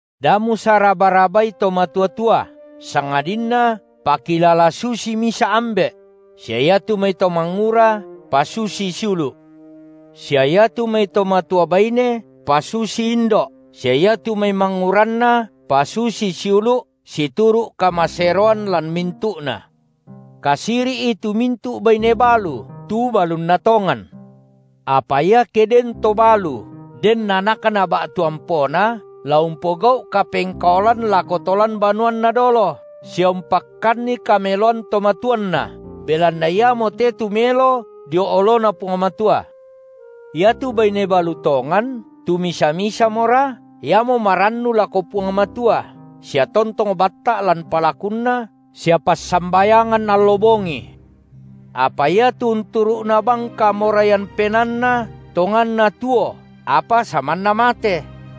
Da musaraba-rabai to matua-tua, sangadinna pakilala susii misa’ ambe’; sia iatu mai to mangura pasusii siulu’; sia iatu mai to matua baine pasusii indo’, sia iatu mai manguranna pasusii siulu’ situru’ kamaseroan lan mintu’na. Kasiri’i tu mintu’ baine balu tu balunna tongan. Apa iake den to balu den anakna ba’tu ampona, la umpogau’ kapengkaolan lako to lan banuanna dolo, sia umpakkanni kameloan to matuanna, belanna iamote tu melo dio oloNa Puang Matua. Iatu baine balu tongan, tu misa-misamora, iamo marannu lako Puang Matua, sia tontong batta’ lan palakunna sia passambayangan allo bongi. Apa iatu unturu’na bang kamoraian penaanna, tonganna tuo apa samanna mate.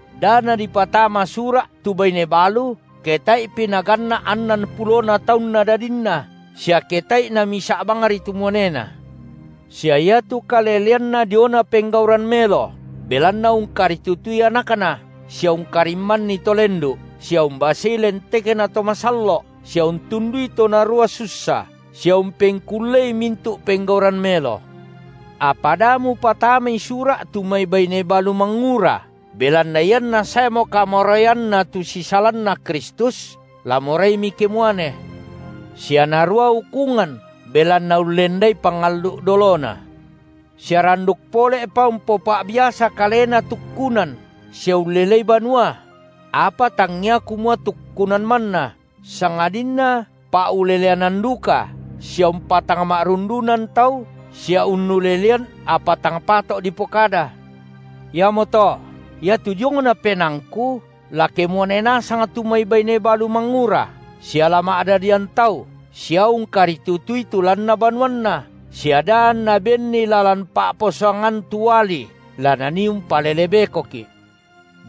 Da nadipatama sura’ tu baine balu ke tae’pi naganna’ annan pulona taunna dadinna, sia ke tae’i namisa’ bangri tu muanena, sia iatu kaleleanna diona penggauran melo, belanna ungkaritutui anakna, sia ungkarimmanni to lendu’, sia umbasei lentekna to massallo’, sia untundui to narua sussa, sia umpengkullei mintu’ penggauran melo. Apa da mupatamai sura’ tu mai baine balu mangura, belanna ianna saemo kamoraianna tu sisalanna Kristus, la moraimi kemuane, sia narua ukungan, belanna ullendai pangallu’ dolona. Sia randuk pole’pa umpopa’biasa kalena tukkunan sia ullelei banua; apa tangia kumua tukkunan manna, sangadinna pa’uleleanan duka sia umpatangma’rundunan tau sia unnulelean apa tang pato’ dipokada. Iamoto, iatu diongna penaangku, la kemuane nasang tu mai baine balu mangura, sia la ma’dadian tau sia ungkaritutui tu lanna banuanna, sia da anna benni lalan pa’posangan tu uali la nanii umpalele bekoki’.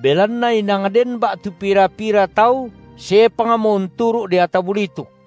Belanna inang den ba’tu pira-pira tau sepangmo unturu’ deata bulituk.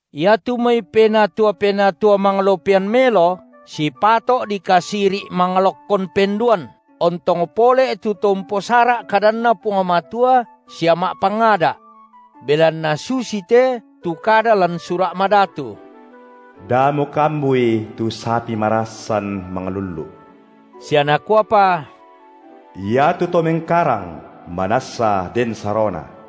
Iatu mai penatua-penatua manglopian melo, sipato’ dikasiri’ manglokkon penduan, ontong pole’ tu to umposara’ kadanNa Puang Matua sia ma’pangada’. Belanna susite tu kada lan Sura’ Madatu: Da mukambui tu sapi marassan manglullu’ sia nakuapa: Iatu to mengkarang, manassa den sarona.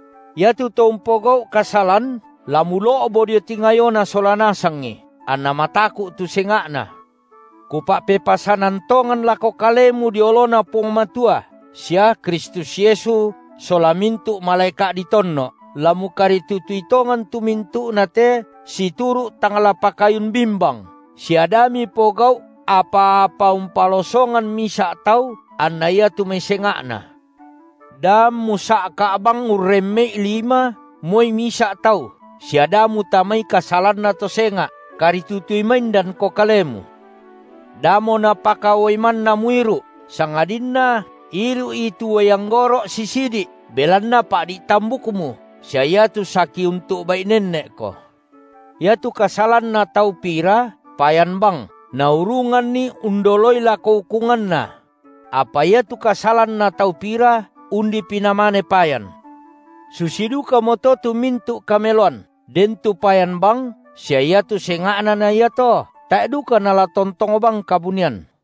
Iatu to umpogau’ kasalan, la mulo’bo dio tingayona sola nasangi, anna mataku’ tu senga’na. Kupa’pepasanan tongan lako kalemu dio oloNa Puang Matua sia Kristus Yesu sola mintu’ malaeka’ ditonno’, la mukaritutui tongan tu mintu’nate situru’ tang la pakayun bimbang, sia da mipogau’ apa-apa umpalosongan misa’ tau anna iatu mai senga’na. Da ammu sa’ka’ bang urremme’i lima moi misa’ tau, sia da mutamai kasalanna to senga’. Karitutui maindanko kalemu. Damo napaka uai manna muiru’, sangadinna iru’i tu uai anggoro’ sisidi’, belanna pa’di’ tambukmu sia iatu saki untu’bai nenne’ko. Iatu kasalanna tau pira payan bang, naurunganni undoloi lako ukunganna; apa iatu kasalanna tau pira undipi namane payan. Susi dukamoto tu mintu’ kameloan, den tu payan bang, sia iatu senga’na na iato, tae’ duka nala tontong bang kabunian.